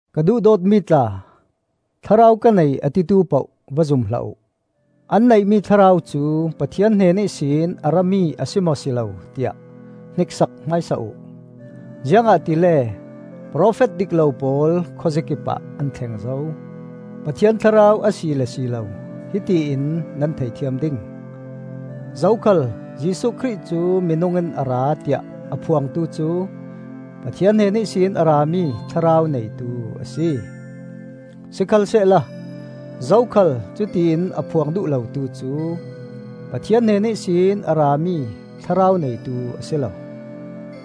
Ka duhdawtmi tla, Thlarau ka nei a titu poh va zum hlah uh. An neihmi thlarau cu Pathian hnen ihsin a rami a si maw si lo tiah hniksak hmaisa uh. Ziangahtile profet dik lo pawl khuazakipah an thleng zo. Pathian Thlarau a si le si lo hiti in nan thei thiam ding: zokhal Jesuh Khrih cu minung in a ra tiah a phuangtu cu Pathian hnen ihsin a rami Thlarau neitu a si. Sikhalsehla zokhal cutiin a phuang duh lotu cu Pathian hnen ihsin a rami Thlarau neitu a si lo.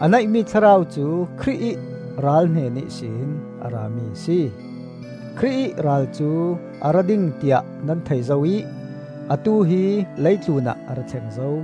A neihmi thlarau cu Khrih ih Ral hnen ihsin a rami a si. Khrih ih Ral cu a ra ding tiah nan thei zo ih atu hi leitlunah a ra thleng zo.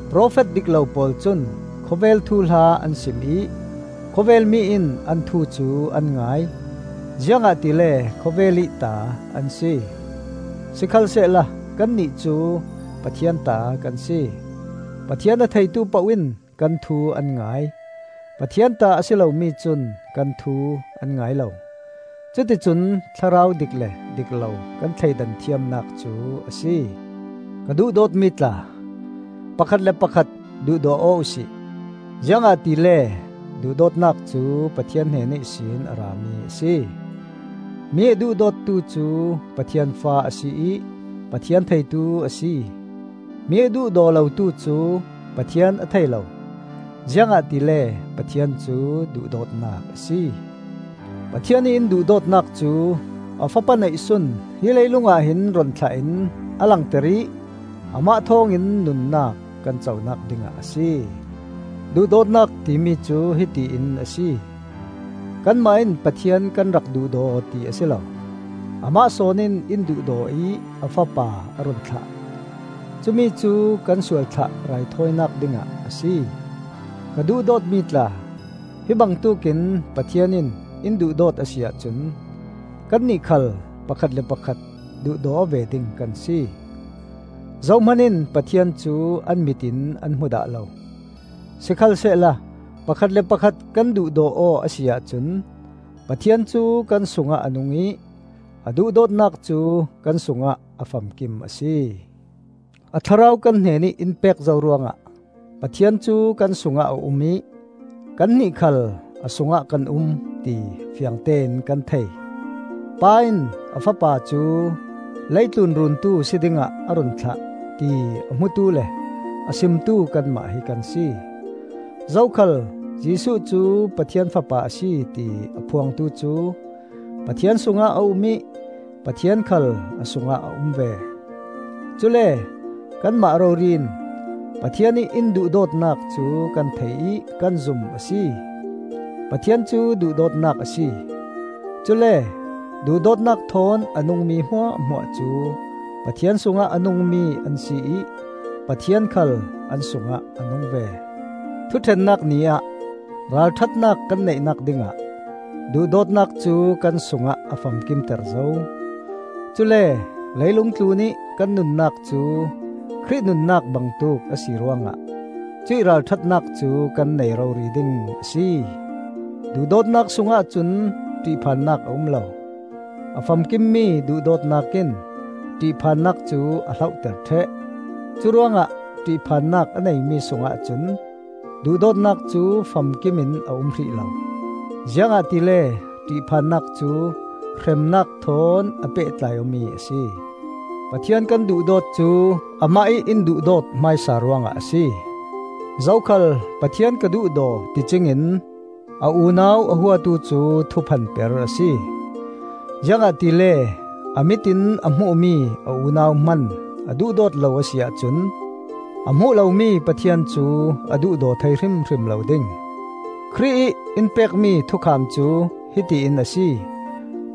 Profet dik lo pawl cun khawvel thuhla an sim ih khawvelmi in an thu cu an ngai, ziangahtile khawvelih ta an si. Sikhalsehla kannih cu Pathian ta kan si. Pathian a theitu poh in kan thu an ngai; Pathian ta a si lomi cun kan thu an ngai lo. Cuticun thlarau dik le dik lo kan thleidan thiamnak cu a si. Ka duhdawtmi tla, pakhat le pakhat duhdaw aw uh si, ziangahtile duhdawtnak cu Pathian hnen ihsin a rami a si. Mi a duhdawtu cu Pathian fa a si ih Pathian theitu a si. Mi a duhdaw lotu cu Pathian a thei lo, ziangahtile Pathian cu duhdawtnak a si. Pathian ih in duhdawtnak cu a Fapa neihsun hi leilungah hin run thlah in a langter ih amah thawngin nunnak kan conak dingah a si. Duhdawtnak timi cu hiti in a si: Kanmah in Pathian kan rak duhdaw ti a si lo, amah sawn in in duhdaw ih a Fapa a run thlah; cumicu kan sualthlah raithawinak dingah a si. Ka duhdawtmi tla, hi bangtuk in Pathian in in duhdawt a si ahcun kannih khal pakhat le pakhat duhdaw aw ve ding kan si. Zohman in Pathian cu an mit in an hmu dah lo, sikhalsehla pakhat le pakhat kan duhdaw aw a si ahcun Pathian cu kan sungah a nung ih a duhdawtnak cu kan sungah a famkim a si. A Thlarau kan hnenih in pek zo ruangah Pathian cu kan sungah a um ih kannih khal a sungah kan um, ti fiangtein kan thei. Pa in a Fapa cu leitlun Runtu si dingah a run thlah, ti a hmutu le a simtu kanmah hi kan si. Zokhal Jesuh cu Pathian Fapa a si ti a phuangtu cu Pathian sungah a um ih Pathian khal a sungah a um ve. Cule kanmah rori in Pathian ih in duhdawtnak cu kan thei ih kan zum a si. Pathian cu duhdawtnak a si, cule duhdawtnak thawn a nungmi hmuahhmuah cu Pathian sungah a nungmi an si ih Pathian khal an sungah a nung ve. Thuṭhennak Ni ah ralṭhatnak kan neihnak dingah duhdawtnak cu kan sungah a famkimter zo. Cule leilung tlunih kan nunnak cu Khrih nunnak bangtuk a si ruangah cuih ralṭhatnak cu kan nei rori ding a si. Duhdawtnak sungah cun ṭihphannak a um lo; a famkimmi duhdawtnak in ṭihphannak cu a hlohter ṭheh. Curuangah ṭihphannak a neimi sungah cun duhdawtnak cu famkimin a um hrih lo, ziangahtile ṭihphannak cu hremnak thawn a pehtlai awmi a si. Pathian kan duhdawt cu amah ih in duhdawt hmaisa ruangah a si. Zokhal Pathian ka duhdaw ticing in a unau a huatu cu thuphanper a si. Ziangahtile a mit in a hmuhmi a unau hman a duhdawt lo a si ahcun a hmuh lomi Pathian cu a duhdaw thei hrimhrim lo ding. Khrih ih in pekmi thukham cu hiti in a si: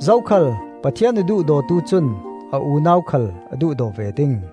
zokhal Pathian a duhdawtu cun a unau khal a duhdaw ve ding.